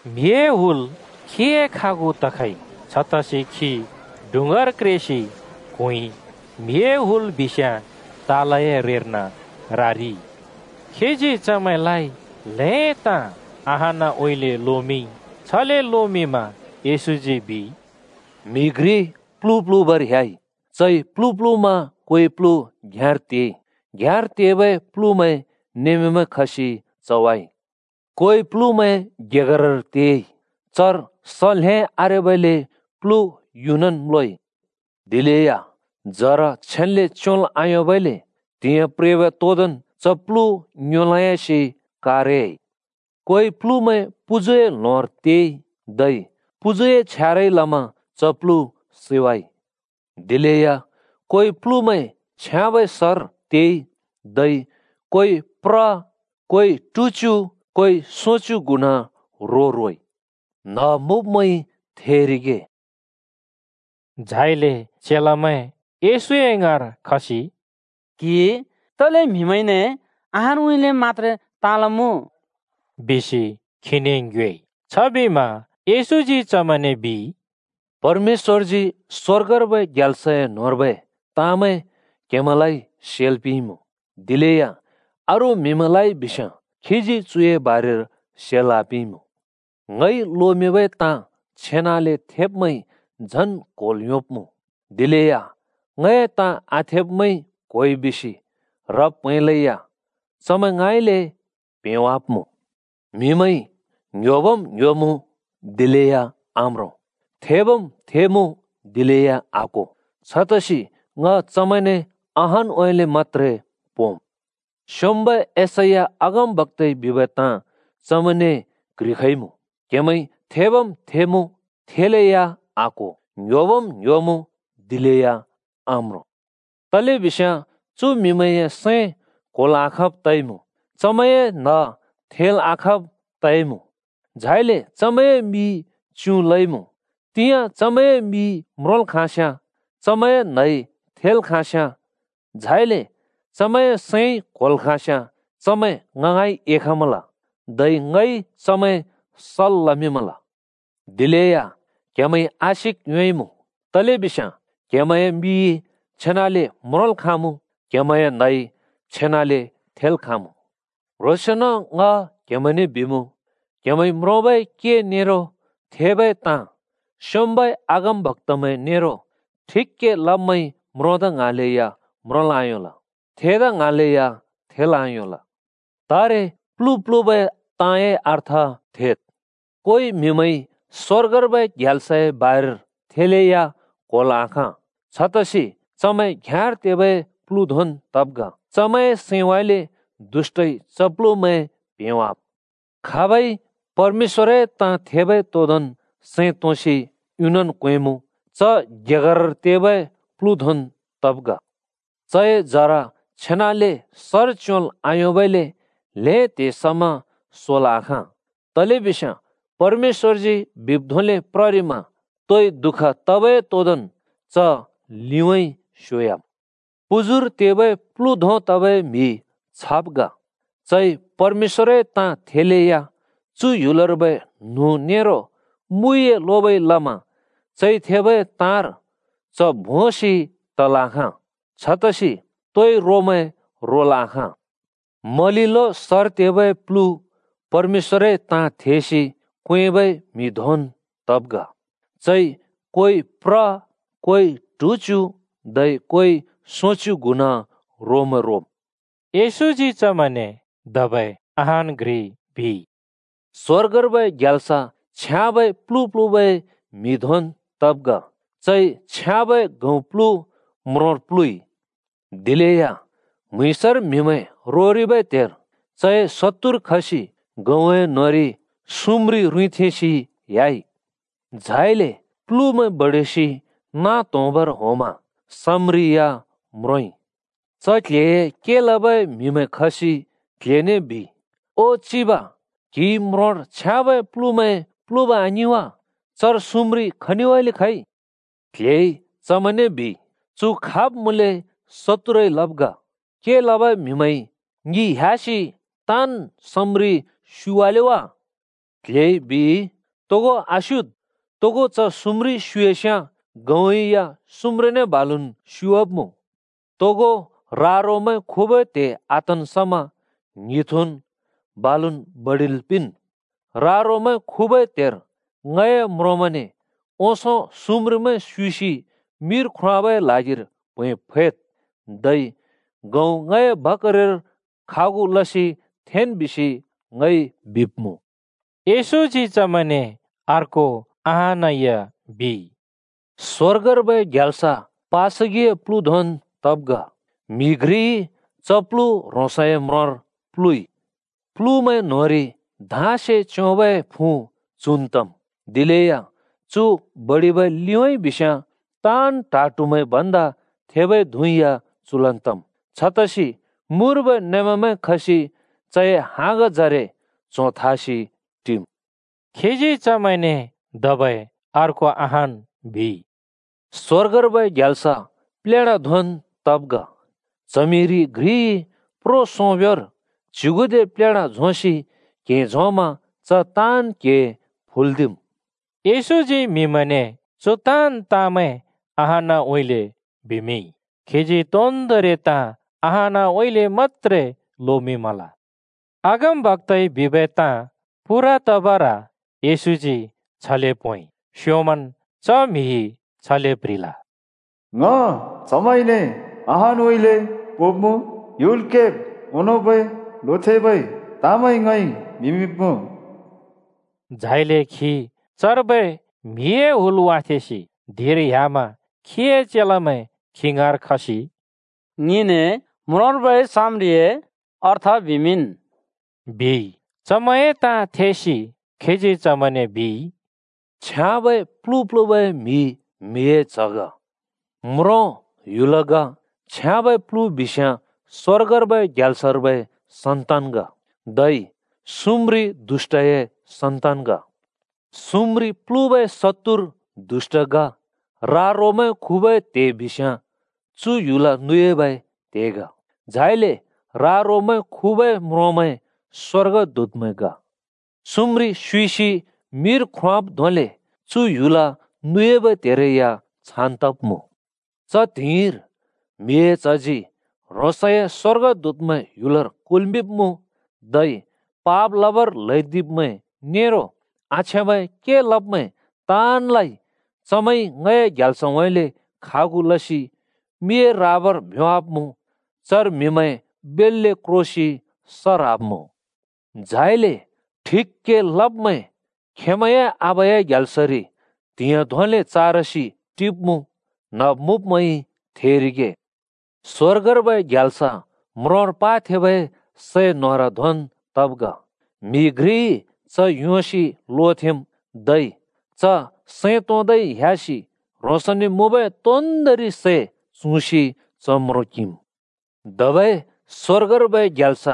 म्‍हिए हुल खीए खागु तखइ। छतसि खी डुँङ्गार क्रेसि क्हुँइ, म्‍हिए हुल बिस्याँ तालए रेर्न रारिइ। खीजी चमैंलाइ ल्हें ताँ अहानउँइँले लोमिंइ। छले लोमिंमा येशूजी बिइ, “म्‍हि घ्रि प्‍लु प्‍लुबर ह्‍याइ। चइ प्‍लु प्‍लुमा कोइ प्‍लु घ्‍याँर तेइ। घ्‍याँर तेबै प्‍लुमैं नेमामैं खसि चवाइ। कोइ प्‍लुमैं गेगरर तेइ। चर स ल्‍हें आरेबइले प्‍लु युनन् म्‍लोइ। दिलेया जरा छेन्‍ले च्‍योंल् आयोंबइले त्‍हिंयाँ प्रेबै तोदोंन् च प्लु ङ्योंलोंयासि कारयाइ। कोइ प्‍लुमैं पुजुए ल्होंर तेइ धै पुजुए छ्यारइ लमा च प्लु सैवाइ। दिलेया कोइ प्‍लुमैं छ्याँबै सर तेइ, धै कोइ प्र, कोइ ट्हुच्‍यु, कोइ सोंच्यु गुणा रो रोइ। “न्ह मुँब्मैंइ थेरिगे।” झाइले चेलामैं येशूए ङाँर खसि “क्‍हिइ तले म्हिमैंने अहानउँइँले मत्‍त्रे ताँ लमुँ?” बिसि खीने ङ्योएइ। छबिमा येशूजी चमैंने बिइ, “परमेश्‍वरजी स्‍वर्गर्बै ग्याल्सए न्होंर्बै ताँमैं क्‍हेमैंलाइ सेल् पिंइमुँ। दिलेया अरू म्हिमैंलाइ बिस्‍याँ खीजी चुए बारेर सेल् आपिंइमुँ। ङइ लोमिंबै ताँ छेनाले थेब्मैंइ झन् क्होल् योंब्मुँ। दिलेया ङए ताँ आथेब्मैंइ क्होइ बिसि ह्रब् प्हैंलेया चमैं ङाँइँले प्हेंवाब्मुँ। म्हिमैंइ ङ्‌ह्‍योबम् ङ्‍ह्‍योमुँ दिलेया आम्रों, थेबम् थेमुँ, दिलेया आक्‍हो। छतसि ङ चमैंने अहानउँइँले मत्‍त्रे पोंम्। स्‍योंम्‍बै यशैया अगमबक्‍ताइ बिबै ताँ चमैंने क्‍ह्रिखइमुँ: क्‍हेमैंइ थेबम् थेमुँ, थेलेया आक्‍हो, ङ्‌ह्‍योबम् ङ्‌ह्‍योमुँ, दिलेया आम्रों। तलेबिस्याँ चु म्‍हिमैंए सैं क्होल् आखाँब् तइमुँ। चमैंए न्‍ह थेल् आखाँब् तइमुँ, झाइले चमैंए मि च्युँ लइमुँ। तिंयाँ चमैंए मिइ म्रोंल् खाँस्‍याँ, चमैंए न्‍हइ थेल् खाँस्‍याँ, झाइले चमैंए सैंइ क्‍होल् खाँस्‍याँ, चमैं ङ ङाँइ एखमल, धै ङइ चमैं सल् लमिंमल। “दिलेया क्हेमैंइ आशिक योंइमुँ, तलेबिस्याँ क्हेमैंए मिइ छेनाले म्रोंल् खाँमुँ, क्‍हेमैंए न्हइ छेनाले थेल् खाँमुँ। क्ह्रोंसेंन ङ क्हेमैंने बिमुँ, क्‍हेमैंइ म्रोंबै के नेरो थेबै ताँ स्‍योंम्‍बै अगमबक्‍तामैं नेरो ठिक के लब्मैंइ म्रोंदा ङ्हाँलेया म्रोंल् आयोंल। थेदा ङ्हाँलेया थेल् आयोंल। “तारे प्‍लु प्‍लुबै ताँए अर्थ थेद्। कोइ म्‍हिमैंइ स्‍वर्गर्बै ग्याल्सए बारेर थेलेया क्‍होल् आखाँ। छतसि चमैं घ्‍याँर तेबै प्‍लु धोंन् तब् ग। चमैंए सैंउँइँले दुष्‍टइ च प्‍लुमैं प्‍हेंवाम्। खाबइ परमेश्‍वरए ताँ थेबै तोदोंन् सैं तोंसि युनन् क्वेंमुँ, च गेगरर तेबै प्‍लु धोंन् तब् ग। चए जरा छेनाले सर च्योंल् आयोंबइले ल्‍हें त्हे समा सोल् आखाँ। तलेबिस्याँ परमेश्‍वरजी बिब् धोंले प्ररिमा तोइ दुःख तबै तोदोंन् च लिउँइँ स्योह्‍याम्। पुजुर तेबै प्लु धों तबै म्हि छाब् ग: चइ परमेश्‍वरए ताँ थेलेया चु ह्‍युलर्बै न्हुँ नेरो मुइए लोबइ लमा चइ थेबै ताँर च भोंसि तल् आखाँ। छतसि तोइ रोमैं रोल् आखाँ। मलिलो सर तेबै प्‍लु परमेश्‍वरए ताँ थेसि क्वेंबै म्‍हि धोंन् तब् ग: चइ कोइ प्र, कोइ ट्हुच्‍यु धै कोइ सोंच्‍यु गुणा रोमैं रोम्।” येशूजी चमैंने धबै अहान् घ्रि बिइ, “स्‍वर्गर्बै ग्याल्स छ्याँबै प्‍लु प्‍लुबै म्‍हि धोंन् तब् ग। चइ छ्याँबै गहुँ प्लु म्रोंर प्लुइ। दिलेया म्‍हुँइँसर म्‍हिमैं रोबै त्हेर चए शत्तुर खसि गहुँए न्होंरि सम्रिं रुँइँथेंसि ह्‍याइ। झाइले प्‍लुमैं बडिसि नाँ त्‍होंबर होंमा सम्रिं या म्रोंइ। च क्‍ल्‍हेए के लबै म्हिमैं खसि क्‍ल्‍हेने बिइ, ‘ओ चिब, क्‍हिइ म्रोंर छ्याँबै प्‍लु प्‍लुइ, आङिं वा? चर सम्रिं खनिउँइँले खइ?’ “क्‍ल्‍हेइ चमैंने बिइ, ‘चु खाब् मुँले शत्तुरइ लब् ग।’ “के लबै म्हिमैंइ ‘ङि ह्‍यासि ताँन् सम्रिं स्‍युइवाले वा?’ बिमा “क्‍ल्‍हेइ बिइ, ‘तोगो आस्‍युइद्! तोगो च सम्रिं स्‍युइस्‍याँ गहुँ या सम्रिंने बालुन् स्‍युवाब्मुँ। तोगो रा-रोमैं खुबै त्हे आतन् समा ङ्हिथुन् बालुन् बडिल् पिंन्। रा-रोमैं खुबै त्हेर ङए म्रोंमैंने “ओंसों सम्रिंमैं स्‍युइसि मिर ख्रोंवाबै ल्हागिर प्हैं फैद्। धै गहुँ ङए भकारिर खागु लसि थेंन् बिसि,” ङइ बिब्मुँ।’” येशूजी चमैंने अर्को अहान या बिइ, “स्‍वर्गर्बै ग्याल्स पासगिए प्‍लु धोंन् तब् ग। म्‍हि घ्रिइ च प्‍लु ह्रोंसए म्रोंर प्‍लुइ। प्‍लुमैं न्‍होंरि धाँसे च्‍योंबै फुँ चुन् तम्। दिलेया चु बडिबै लिउँइँ बिस्‍याँ ताँन् ट्हा ट्हुमैं भन्दा थेबै धुँ या चुलन् तम्। छतसि मुर्बै नेमामैं खसि चए हाँगजरे च्‍हों थासि टिम्।” खीजी चमैंने धबै अर्को अहान् बिइ, “स्‍वर्गर्बै ग्याल्स प्लेढा धोंन् तब् ग। च्हमिरि घ्रिइ प्रो सोंब्‍योंर च्युगुदे प्लेढा झोंसि क्हें झोंमा च ताँन् क्हें फुल्दिम्।” येशूजी म्‍हिमैंने चु ताँन् ताँमैं अहानउँइँले बिमिंइ। खीजी तोन्दोंरि ताँ अहानउँइँले मत्‍त्रे लोमिंमल। अगमबक्‍ताइ बिबै ताँ पूरा तबर येशूजी छले पोंइ। स्योंमन् च म्हिइ छले प्ह्रिल, “ङ चमैंने अहानउँइँले पोंब्‍मुँ। ह्‍युल केब् ओंनोंबै लोथेंबै ताँमैं ङइ बिमिंब्‍मुँ।” झाइले खी चर्बै म्‍हिए हुल वाथेंसि धिंर ह्‍यामा खीए चेलामैं खी ङाँर खसि “ङिने म्रोंर्बै सम्रिंए अर्थ बिमिंन्,” बिइ। चमैंए ताँ थेसि खीजी चमैंने बिइ, “छ्याँबै प्‍लु प्‍लुबै म्हि म्हिए च्ह ग। म्रों ह्‍युल ग। छ्याँबै प्‍लु बिस्याँ स्‍वर्गर्बै ग्याल्सर्बै सन्‍तान ग, धै सम्रिं दुष्‍टए सन्‍तान ग। सम्रिं प्‍लुबै शत्तुर दुष्‍ट ग। रा-रोमैं खुबै त्हे बिस्याँ चु ह्‍युल नुयाबै त्हे ग। झाइले रा-रोमैं खुबै म्रोंमैं स्‍वर्गदूतमैं ग। सम्रिं स्युइसि मिर ख्रोंवाब् धोंले चु ह्‍युल नुयाबै त्हेरै या छान् तब्‍मुँ। च त्हिंइर म्हिए च्हजी ह्रोंसए स्‍वर्गदूतमैं ह्‍युलर कुल्‍मिंब्‍मुँ, धै पाप लबर ल्हैदिब्मैं नेरो आछ्याँबै के लब्मैं ताँनलाइ चमैंइ ङए ग्याल्सउँइँले खागु लसि मिए राबर भ्‍योंवाब्‍मुँ। चर म्हिमैं बेल्‍ले क्रोसि स ह्राब्‍मुँ। झाइले ठिक के लब्मैं खेंमैंए आबाए ग्याल्सरि त्‍हिंयाँ धोंले चारसि टिब्‍मुँ। “न्ह मुँब्मैंइ थेरिगे।” “स्‍वर्गर्बै ग्याल्स म्रोंर पाथेंबै सै न्होर धोंन् तब् ग। म्‍हि घ्रिइ च योंसि लोथेंम्, धै च सैं तोंदै ह्‍यासि ह्रोंसने मुँबै तोन्दोंरि सै चुँसि च म्रों किंम्। “धबै स्‍वर्गर्बै ग्याल्स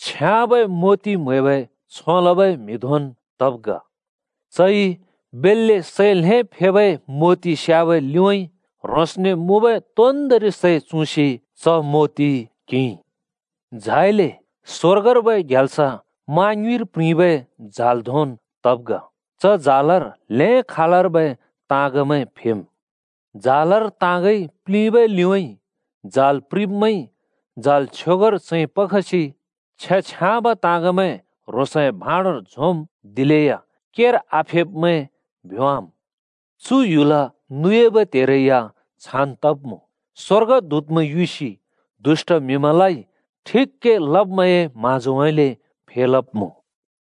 छ्याँबै मोति म्‍हैबै छों लबै म्हि धोंन् तब् ग। चइ बेल्‍ले सै ल्हें फेबै मोति स्याबै लिउँइँ ह्रोंसने मुँबै तोन्दोंरि सै चुँसि च मोति किंइ। “झाइले स्‍वर्गर्बै ग्याल्स मा ङ्युँइर प्रिंबै जाल धोंन् तब् ग। च जालर ल्हें खालर्बै ताँगमैं फेम्। जालर ताँगइ प्‍लिंबै लिउँइँ जाल प्रिंब्मैंइ जाल छ्योगर चैंपखसि छ्याँ-छ्याँब ताँगमैं ह्रोंसए भाँडोर झोंम्, दिलेया केर आफेब्मैं भ्‍योंवाम्। चु ह्‍युल नुयाबै त्हेरै या छान् तब्‍मुँ: स्‍वर्गदूतमैं युसि दुष्‍ट म्‍हिमैंलाइ ठिक के लब्मैंए म्‍हाँजोउँइँले फेलब्‍मुँ।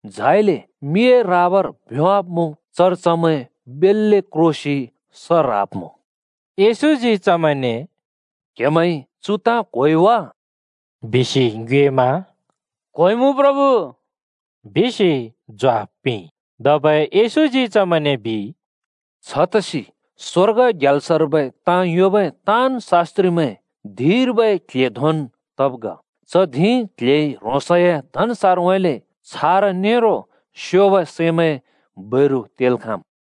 झाइले मिए राबर भ्‍योंवाब्‍मुँ। चर चमैं बेल्‍ले क्रोसि स ह्राब्‍मुँ।” येशूजी चमैंने “क्‍हेमैंइ चु ताँ क्‍होइ वा?” बिसि ङ्योएमा “चमैंइ क्होइमुँ,” बिसि ज्वाफ पिंइ। धबै येशूजी चमैंने बिइ, “छतसि स्वर्ग ग्याल्सर्बै ताँ योंबै ताँन् शास्‍त्रिमैं धिंर्बै क्‍ल्‍हे धोंन् तब् ग। च धिं क्‍ल्‍हेइ ह्रोंसए धनसारउँइँले छारा नेरो स्योब सैमैं बैरु तेल् खाँम्।”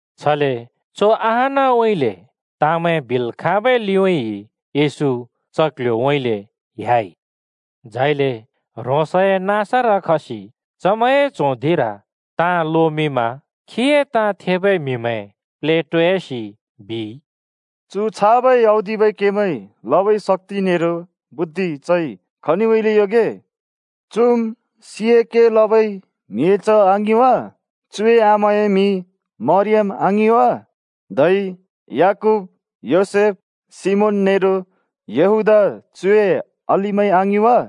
छले चु अहानउँइँले ताँमैं बिल् खाँबै लिउँइँ येशू च क्‍ल्‍ह्‍योउँइँले ह्‍याइ। झाइले ह्रोंसए नाँसर खसि चमैंए च्हों धिंर ताँ लोमिंमा खीए ताँ थेबै म्हिमैं प्लेटोयासि बिइ, “चु छाबै औदिबै केमैं लबै शक्‍ति नेरो बुद्धि चइ खनिउँइँले योंगे? चुम् सिंए के लबै म्हिए च्‍ह आङिं वा? चुए आमाए मिं मरियम आङिं वा? धै याकूब, योसेफ, सिमोन नेरो यहूदा चुए अलिमैं आङिं वा?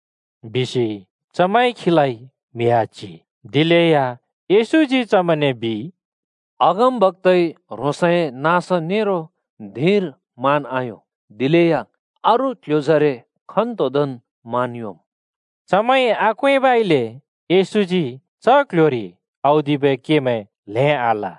बिसि चमैंइ खीलाइ म्हि आच्हि। दिलेया येशूजी चमैंने बिइ, “अगमबक्‍ताइ ह्रोंसए नाँस नेरो धिंर मान आयों, दिलेया अरू क्ल्ह्‍योजरे खन्‍तोदोंन् मान योंम्।” चमैंइ आक्वेंबइले येशूजी च क्‍ल्‍ह्‍योरि औदिबै केमैं ल्‍हें आल।